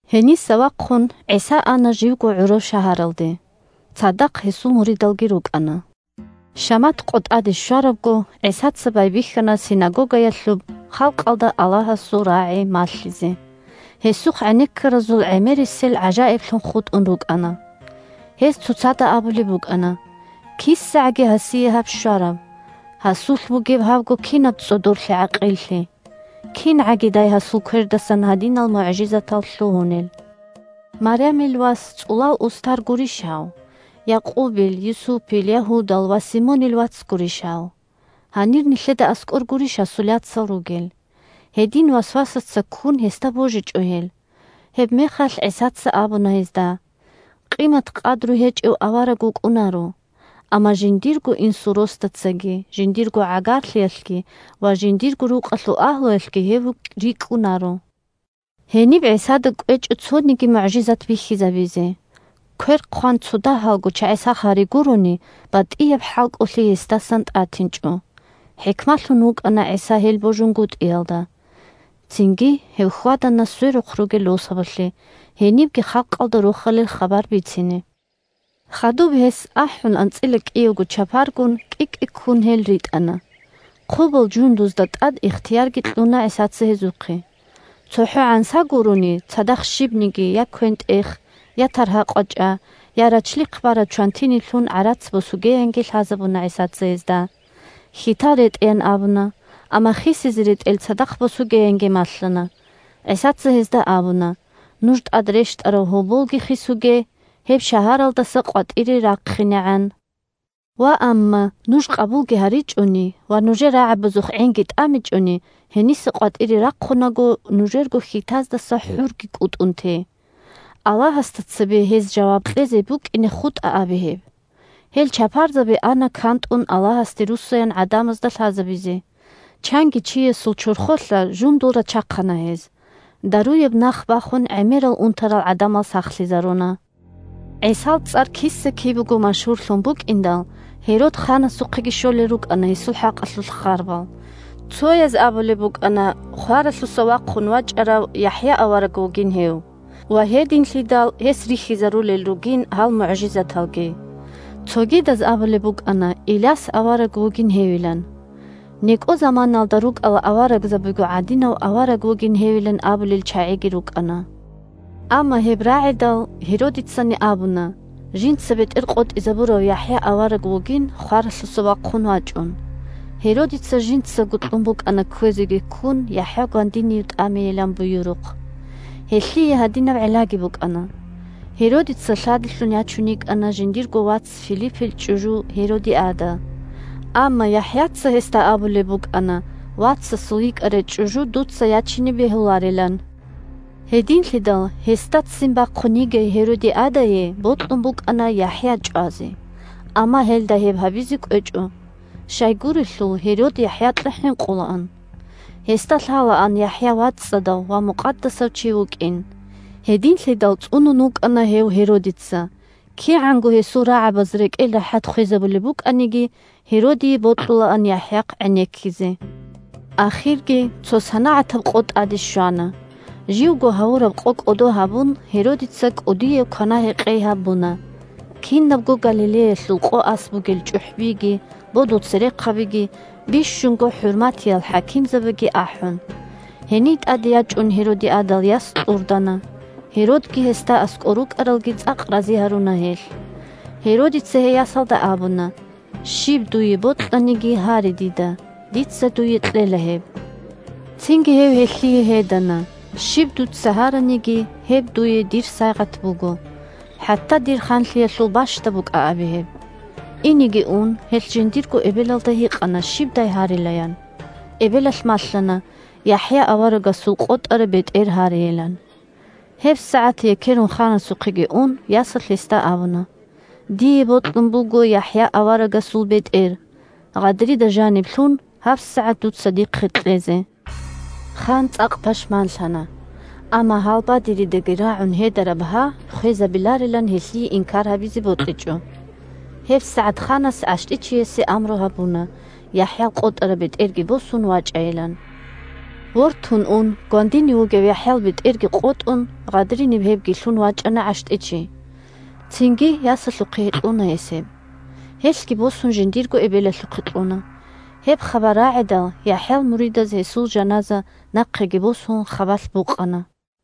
Гьениса вахъун ГӀиса ана живго гӀураб шагьаралде. Цадахъ гьесул муридалги рукӀана. Шамат къо тӀаде щварабго, ГӀисаца байбихьана синагогаялъуб халкъалда Аллагьасул рагӀи малъизе. Гьесухъ гӀенеккаразул гӀемерисел гӀажаиблъун хутӀун рукӀана. Гьез цоцазда абулеб букӀана: – КисагӀаги гьасие гьаб щвараб? Гьасулъ бугеб гьабго кинаб цӀодорлъи-гӀакъиллъи? КингӀагидай гьасул квердасан гьадинал мугӀжизатал лъугьунел? Марямил вас цӀулал устар гурищ гьав? Якъубил, Юсупил, Ягьудал ва Симонил вац гурищ гьав? Гьанир нилъеда аскӀор гурищ гьасул яцал ругел? Гьедин васвасаца ккун гьесда божичӀо гьел. Гьебмехалъ ГӀисаца абуна гьезда: – Къимат-къадру гьечӀев авараг вукӀунаро; амма жиндирго инсул росдацаги, жиндирго гӀагарлъиялъги ва жиндирго рукъалъул агьлуялъги гьев рикӀкӀунаро. Гьениб ГӀисада кӀвечӀо цониги мугӀжизат бихьизабизе. (Квер хъван цодагьалго чагӀи сах гьари гурони, батӀияб хӀалкӀолъиги гьесдасан тӀатинчӀо.) ХӀикмалъун вукӀана ГӀиса гьел божунгутӀиялда. ГӀисаца чапарзаби халкъалъухъе ритӀула Цинги гьев хьвадана сверухъ ругел росабалъе, гьенибги халкъалда Рохалил хабар бицине. Хадуб гьес, ахӀун анцӀила кӀиявго чапаргун, кӀи-кӀиккун гьелги ритӀана. Хъубал жундузда тӀад ихтиярги кьуна ГӀисаца гьезухъе. ЦохӀо гӀанса гурони, цадахъ щибниги: я квен-тӀех, я таргьа-къвачӀа, я рачлихъ бараб чвантиниб лъун гӀарац босугеянги лъазабуна ГӀисаца гьезда. Хьитал ретӀеян абуна, амма хисизе ретӀел цадахъ босугеянги малъана. ГӀисаца гьезда абуна: – Нуж тӀад рещтӀарав гьоболги хисуге, гьеб шагьаралдаса къватӀире рахъинегӀан. Ваамма нуж къабулги гьаричӀони, ва нужер рагӀабазухъ гӀинги тӀамичӀони, гьениса къватӀире рахъунаго, нужерго хьитаздаса хӀурги кӀутӀун те. Аллагьасда цебе гьез жаваб кьезе букӀине хутӀа абе гьеб. Гьел чапарзаби ана кантӀун Аллагьасде руссаян гӀадамазда лъазабизе. Чанги чиясул чорхолъа жундул рачахъана гьез. Даруяб нах бахун гӀемерал унтарал гӀадамал сахлъизаруна. ГӀисал цӀар киса-кибего машгьурлъун букӀиндал, Гьерод ханасухъеги щолел рукӀана гьесул хӀакъалъулъ харбал. Цояз абулеб букӀана, хваралъуса вахъун вачӀарав ЯхӀя авараг вугин гьев, ва гьединлъидал гьес рихьизарулел ругин гьал мугӀжизаталги. Цогидаз абулеб букӀана Иляс авараг вугин гьевилан. НекӀо заманаялда рукӀарал аварагзабиго гӀадинав авараг вугин гьевилан абулел чагӀиги рукӀана. Амма гьеб рагӀидал, Гьеродицани абуна, жинца бетӀер къотӀизабурав ЯхӀя авараг вугин, хваралъуса вахъун вачӀун. Гьеродица жинцаго кьун букӀана кквезеги ккун ЯхӀя гвандинив тӀамейилан буюрухъ. Гьелъие гьадинаб гӀиллаги букӀана: Гьеродица лъадилъун ячун йикӀана жиндирго вац Филиппил чӀужу Гьеродиада. Амма ЯхӀяца гьесда абулеб букӀана вацасул йикӀарай чӀужу дуца ячине бегьуларилан. Гьединлъидал гьесда ццин бахъун йигей Гьеродиадае бокьун букӀана ЯхӀя чӀвазе. Амма гьелда гьеб гьабизе кӀвечӀо. Щайгурелъул Гьерод ЯхӀякьа хӀинкъулаан. Гьесда лъалаан ЯхӀя вацӀцӀадав ва мукъадасав чи вукӀин. Гьединлъидал цӀунун вукӀана гьев Гьеродица. КигӀанго гьесул рагӀабаз рекӀел рахӀат хвезабулеб букӀаниги, Гьеродие бокьулаан ЯхӀяхъ гӀенеккизе. Ахирги цо санагӀатаб къо тӀаде щвана. Живго гьавураб къо кӀодо гьабун Гьеродица кӀудияб квана-гьекъей гьабуна, кинабго Галилеялъул къо-ас бугел чӀухӀбиги, бодул церехъабиги, бищунго хӀурматиял хӀакимзабиги ахӀун. Гьений тӀаде ячӀун Гьеродиадал яс кьурдана, Гьеродги гьесда аскӀор рукӀаралги цӀакъ рази гьаруна гьелъ. Гьеродица гьей ясалда абуна: – Щиб дуе бокьаниги, гьаре дида, дица дуе кьела гьеб. Цинги гьев гьелъие гьедана: – Щиб дуца гьараниги, гьеб дуе дир сайигъат буго, хӀатта дир ханлъиялъул бащдаб букӀа абе гьеб. Инеги ун, гьелъ жиндирго эбелалда гьикъана щибдай гьарилаян. Эбелалъ малъана ЯхӀя аварагасул къотӀараб бетӀер гьарейилан. ГьебсагӀат, екерун ханасухъеги ун, ясалъ гьесда абуна: – Дие бокьун буго ЯхӀя аварагасул бетӀер, гъадрида жаниб лъун, гьабсагӀат дуца дихъе кьезе. Хан цӀакъ пашманлъана. Амма гьалбадеридаги рагӀун гьедараб гьа хвезабиларилан гьелъие инкар гьабизе бокьичӀо. ГьебсагӀат ханас гӀащтӀичиясе амру гьабуна, ЯхӀял къотӀараб бетӀерги босун вачӀайилан. Вортун ун, гвандинив вугев ЯхӀял бетӀерги къотӀун, гъадриниб гьебги лъун вачӀана гӀащтӀичи. Цинги ясалъухъе кьуна гьес гьеб. Гьелъги босун жиндирго эбелалъухъе кьуна. Гьеб хабар рагӀидал, ЯхӀял муридаз гьесул жаназа, нахъеги босун, хабалъ букъана.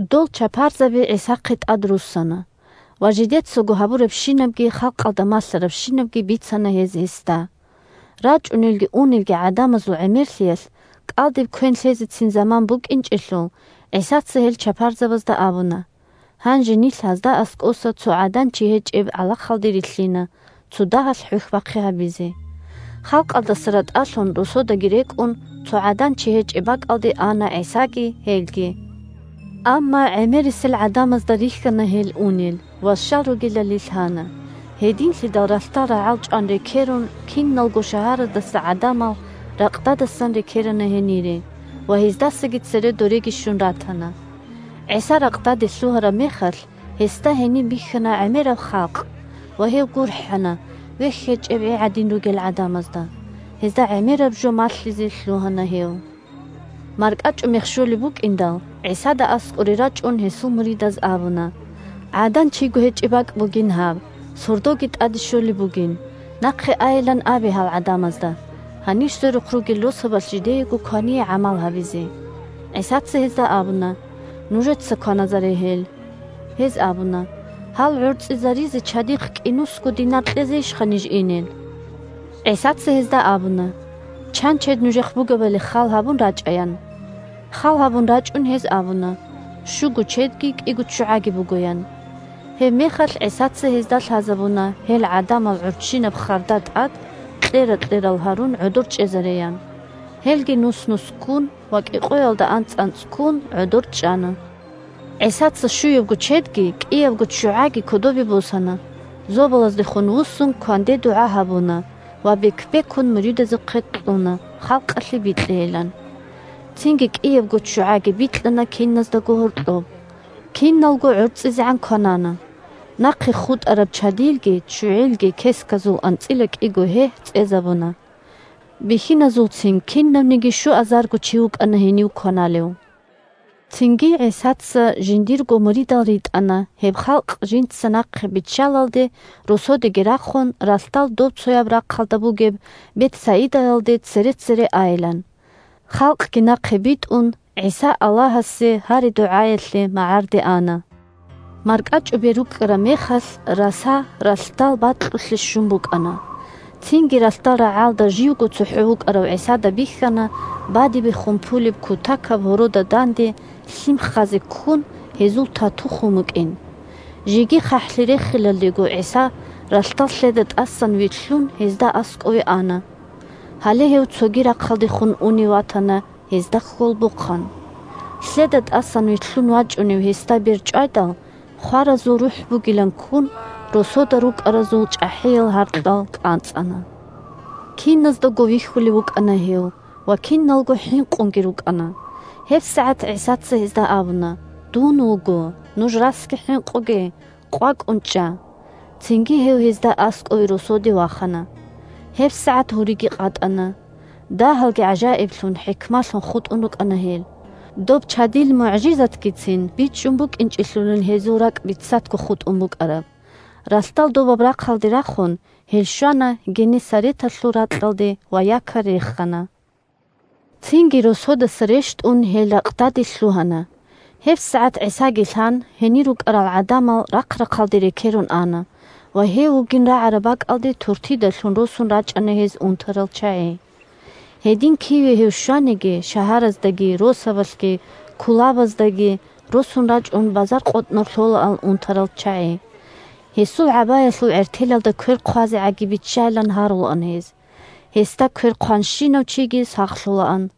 Дол чапарзаби ГӀисахъе тӀадруссана, ва жидецаго гьабурабщинабги халкъалда малъарабщинабги бицана гьез гьесда. РачӀунелги унелги гӀадамазул гӀемерлъиялъ кӀалдиб квен лъезецин заман букӀинчӀелъул, ГӀисаца гьел чапарзабазда абуна: – Гьанже нилъ гьазда аскӀоса цо гӀадан-чи гьечӀеб гӀалахалде рилълъина цодагьалъ хӀухьбахъи гьабизе. Халкъалдаса ратӀалъун, росодаги рекӀун, цо гӀадан-чи гьечӀеб бакӀалде ана ГӀисаги гьелги. Амма гӀемерисел гӀадамазда рихьана гьел унел ва щал ругелали лъана. Гьединлъидал ралъдал рагӀалчӀван рекерун, киналго шагьараздаса гӀадамал ракъдадасан рекерана гьенире, ва, гьаздасаги цере дореги щун ратана. ГӀиса ракъдаде лъугьараб мехалъ, гьесда гьениб бихьана гӀемераб халкъ, ва гьев гурхӀана вехь гьечӀеб гӀи гӀадин ругел гӀадамазда; гьезда гӀемераб жо малъизе лъугьана гьев. МаркӀачӀумех щолеб букӀиндал, ГӀисада аскӀоре рачӀун гьесул муридаз абуна: – ГӀадан-чиго гьечӀеб бакӀ бугин гьаб, сордоги тӀаде щолеб бугин, нахъе айилан абе гьал гӀадамазда, гьанир сверухъ ругел росабалъ жидеего квание гӀамал гьабизе. ГӀисаца гьезда абуна: – Нужеца кваназаре гьел. Гьез абуна: – Гьал гӀорцӀизаризе чадихъ кӀинусго динар кьезейищха ниж инел? ГӀисаца гьезда абуна: – Чан чед нужехъ бугебали хал гьабун рачӀа, – ян. Хал гьабун рачӀун гьез абуна: – Щуго чедги кӀиго ччугӀаги буго, – ян. Гьебмехалъ ГӀисаца гьезда лъазабуна гьел гӀадамал гӀурччинаб харда тӀад, кьера-кьерал гьарун, гӀодор чӀезареян. Гьелги нус-нусккун ва кӀикъоялда анцӀ-анцӀккун гӀодор чӀана. ГӀисаца щуябго чедги кӀиябго ччугӀаги кодобе босана, зобалаздехун вуссун кванде дугӀа гьабуна ва бек-бекун муридазухъе кьуна, халкъалъе бикьейилан. Цинги кӀиябго ччугӀаги бикьана киназдаго гьоркьоб. Киналго гӀорцӀизегӀан кванана. Нахъе хутӀараб чадилги ччугӀилги кесказул анцӀила кӀиго гьегь цӀезабуна. Бихьиназулцин кинавниги щуазарго чи вукӀана гьенив кваналев. Цинги ГӀисаца жиндирго муридал ритӀана, гьеб халкъ жинца нахъе биччалалде, росодеги рахун, ралъдал добцояб рахъалда бугеб Бетсаидаялде цере-цере айилан. Халкъги нахъе битӀун, ГӀиса Аллагьасе гьари-дугӀаялъе магӀарде ана. МаркӀачӀубер рукӀкӀараб мехалъ раса ралъдал бакьулъе щун букӀана. Цинги ралъдал рагӀалда живго цохӀо вукӀарав ГӀисада бихьана бадибехун пулеб кутакаб гьорода данде лъим ххазе ккун, гьезул тату хун букӀин. Жеги хъахӀлъи рехилалдего ГӀиса ралъдал лъеда тӀасан вилълъун гьезда аскӀове ана. Гьале гьев цоги рахъалдехун унев ватана гьезда хьолбохъан. Лъеда тӀасан вилълъун вачӀунев гьесда бер чӀвайдал, хваразул рухӀ бугилан ккун, росода рукӀаразул чӀахӀиял гьаркьал кӀанцӀана. Киназдаго вихьулев вукӀана гьев, ва киналго хӀинкъунги рукӀана. ГьебсагӀат ГӀисаца гьезда абуна: – Дун вуго! Нуж расги хӀинкъуге! КъвакӀун чӀа! Цинги гьев гьезда аскӀове росоде вахана. ГьебсагӀат гьуриги къатӀана. Дагьалги гӀажаиблъун, хӀикмалъун хутӀун рукӀана гьел. Доб чадил мугӀжизатгицин бичӀчӀун букӀинчӀелъулин гьезул ракӀ бицатго хутӀун букӀараб. Ралъдал добаб рахъалде рахун, гьел щвана Геннесареталъул ракьалде ва якорь рехана. Цинги росодаса рещтӀун гьел ракъдаде лъугьана. ГьебсагӀат ГӀисаги лъан, гьенир рукӀарал гӀадамал рахъ-рахъалде рекерун ана, ва гьев вугин рагӀараб бакӀалде туртида лъун росун рачӀана гьез унтарал чагӀи. Гьедин, киве гьев щваниги – шагьараздаги, росабалъги, кулабаздаги, – росун рачӀун базар къотӀнор лъолаан унтарал чагӀи. Гьесул гӀабаялъул гӀертелалда квер хъвазегӀаги биччайилан гьарулаан гьез. Гьесда квер хъванщинав чиги сахлъулаан.